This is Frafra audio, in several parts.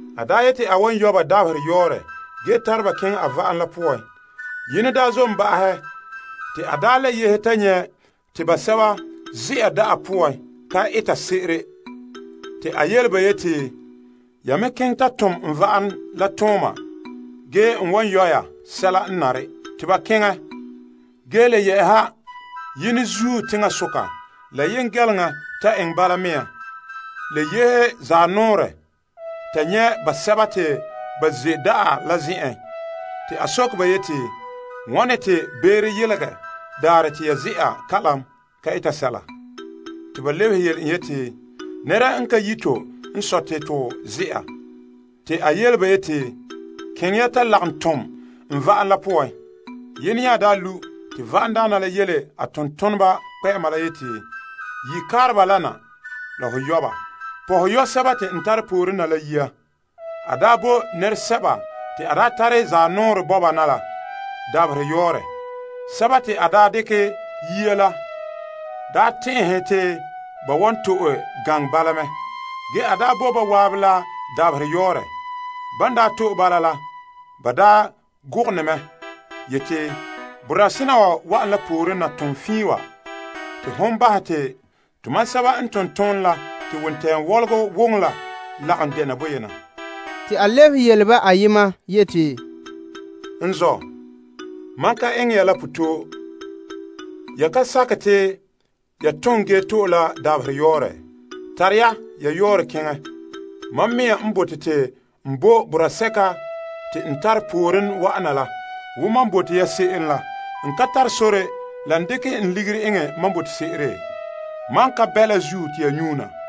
A daa yeti a wan yɔ' ba dabaherɛ yɔɔrɛ ge tare ba keŋɛ a va'am la poan. Yene n zom ba'ahɛ te a daa le yehe ta nyɛ' te basɛba ze'a da'a poan ka eta se'ere. A yele ba yeti, Ya me keŋɛ ta tom n va'am la tooma ge n wan yɔ' ya sɛla n nare. Te ba keŋɛ. Ge a le yehe yene zuo teŋasoka, la yengɛleŋa ta eŋɛ bala. Le yehe zanɔɔrɛ ta nyɛ' basɛba te ba ze' da'a la zen'en te a soke ba yeti, Wane te beere yelegɛ daarɛ te ya ze'a kalam ka eta sɛla? Ba lebehe yeti, Nɛra n ka yi' to n sɔe te to ze'a. A yele ba yeti, Keŋɛ ya ta lagom tom n va'am la poan. Yene nya lu' te va'amdaana la yele a tontoneba kpɛ'ɛma yeti, Yi' kaareba la na la ho yɔ' ba. Pɔhɛ yɔ' sɛba te n tare pooren na la yia. A bo nɛresɛba te a tare zanɔɔrɛ bɔba na la dabaherɛ yɔɔrɛ. Sɛba te a dekɛ yia la tɛn'ɛhe te ba wan to'e gaŋɛ bala mɛ. Ge a bo ba zan'an la dabaherɛ yɔɔrɛ. Ban to'e bala la, ba gogone mɛ yeti, Boraa sena wa wa'an la pooren na ton fiin wa, te hon bahɛ te tomam sɛba n ton toonɛ la te wontɛɛŋa wɔlɔgɔ woŋe la lagom dɛna boyena. Ge a lebehe yele ba ayema yeti, N zɔ', mam ka eŋɛ ya la potɔɔ. Ya ka sakɛ te ya ton ge to'e la dabaherɛ yɔɔrɛ? Tare ya ya yɔɔrɛ keŋɛ. Mam mɛŋa n bote te n bo boraa sɛka te n tare pooren wa'ana la wo mam bo ya se'em la. N ka tare sore la n dekɛ n ligiri eŋɛ mam bote se'ere? Mam ka bɛ la zuo te ya nyuuna.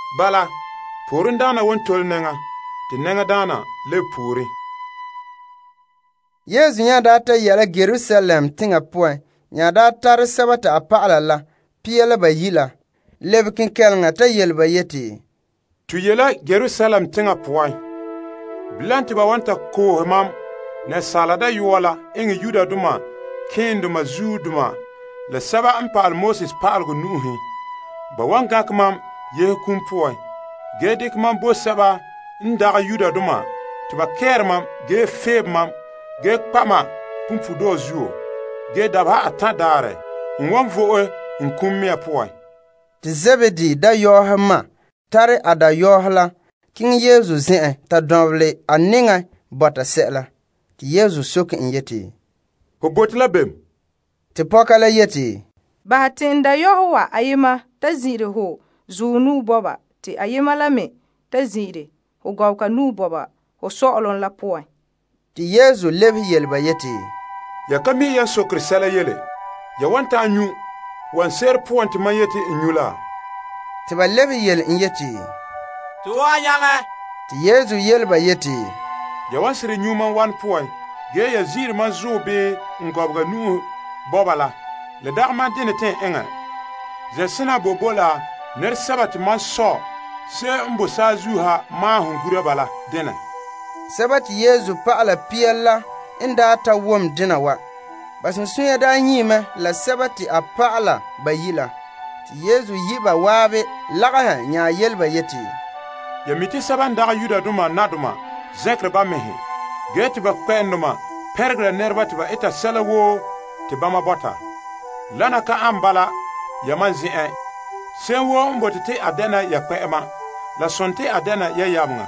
Bala, poorendaana wan tole nɛŋa, te nɛŋadaana lebe pooren. Yesu n daa ta yɛ'a la Yerusalem, a tare a dɔlɔba la pia la bayi' la lebe kenkɛleŋa ta yele ba yeti, To ye' la Yerusalem teŋa poan. Bilam te ba wan ta koohe Asaala Dayɔa la eŋɛ malema keendoma la pa'alegɔ pa'ala nu'uhen. Ba wan gankɛ en te ba ko' en, ge dekɛ en bo sɛba n dagɛ Yudoma te ba kɛɛre en ge feebe en ge kpa' en punpuuredɔɔ zuo. Ge dabeha atan' daarɛ a wan vo'e a kum poan. Zebedee dayɔɔhe ma nya tare a dayɔɔhe la keŋɛ Yesu zen'en ta dɔnbelɛ a nɛŋa bɔta sɛla. Yesu soke en yeti, Ho bote la bem? Te pɔka la yeti, Bahɛ te n dayɔɔhe wa ayema ta zin'ire ho zuɔ te ayema la me ta zin'ire ho gɔbega ho sɔ'ɔlom la poan. Yesu lebehe yele ba yeti, Ya ka mi' yan sokere sɛla yele. Ya wan ta'an nyu' wanɛ se'ere poan te mam yeti n nyu' la? Ba lebehe yele en yeti, To wan nyaŋɛ. Yesu yele ba yeti, Ya wan seren nyu' mam wanɛ la poan. Ge ya zin'ire mam zuɔ bii n gɔbega la, lan dagɛ mam denɛ te n eŋɛ. Zen'sena boe bo la nɛresɛba te mam Sɔ' maahom gura ba la denɛ. Dɔlɔba pia la n daa ta wom dena wa, ba sunsunya daa nyie mɛ la sɔɔnrɔ toyi' la. Yesu yi' ba zan'an lagahɛ nya yele ba yeti, Ya mi' te sɛba n dagɛ Yudoma nadoma zɛnkere ba mɛhe, ge te ba kpɛ'ɛndoma pɛnregera nɛreba te ba eta sɛla woo te bama bɔta. Wana ka ane bala yamam zen'en. Se'em ya poan han bɔta te a dɛna ya kpɛ'ɛma, a dɛna ya yameŋa,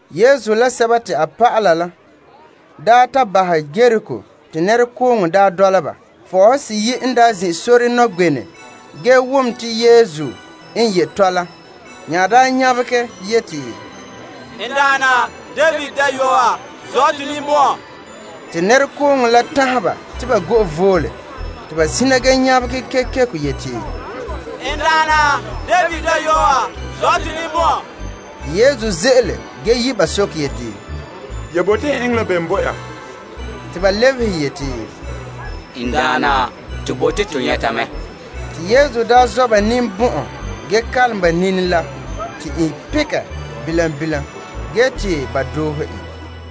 Yesu la a dɔlɔba lan daa ta bahɛ Yeriko, nɛrekooŋɔ dɔla ba. Fɔɔhe seyi' n daa zin' sore nɔgbenɛ ge wom te Yesu n ye' tɔla nya nyabegɛ yeti, N daana, David dayɔa, zɔ' to ninbɔn'ɔn! Te nɛrekooŋɔ la tanhɛ ba te ba go'e voole, te ba sina ge nyabegɛ kekeko yeti, N Daana, David dayɔa, zɔ' to ninbɔn'ɔn! Yesu ze'ele ge yi' ba soke yeti, Ya bote n eŋɛ la bem bo ya? Ba lebehe yeti, N Daana, to bote to nyɛta mɛ. Yesu zɔ' ba ninbɔn'ɔn ge kalom ba nini la. Te i pekɛ bilam bilam ge te ba doohe en.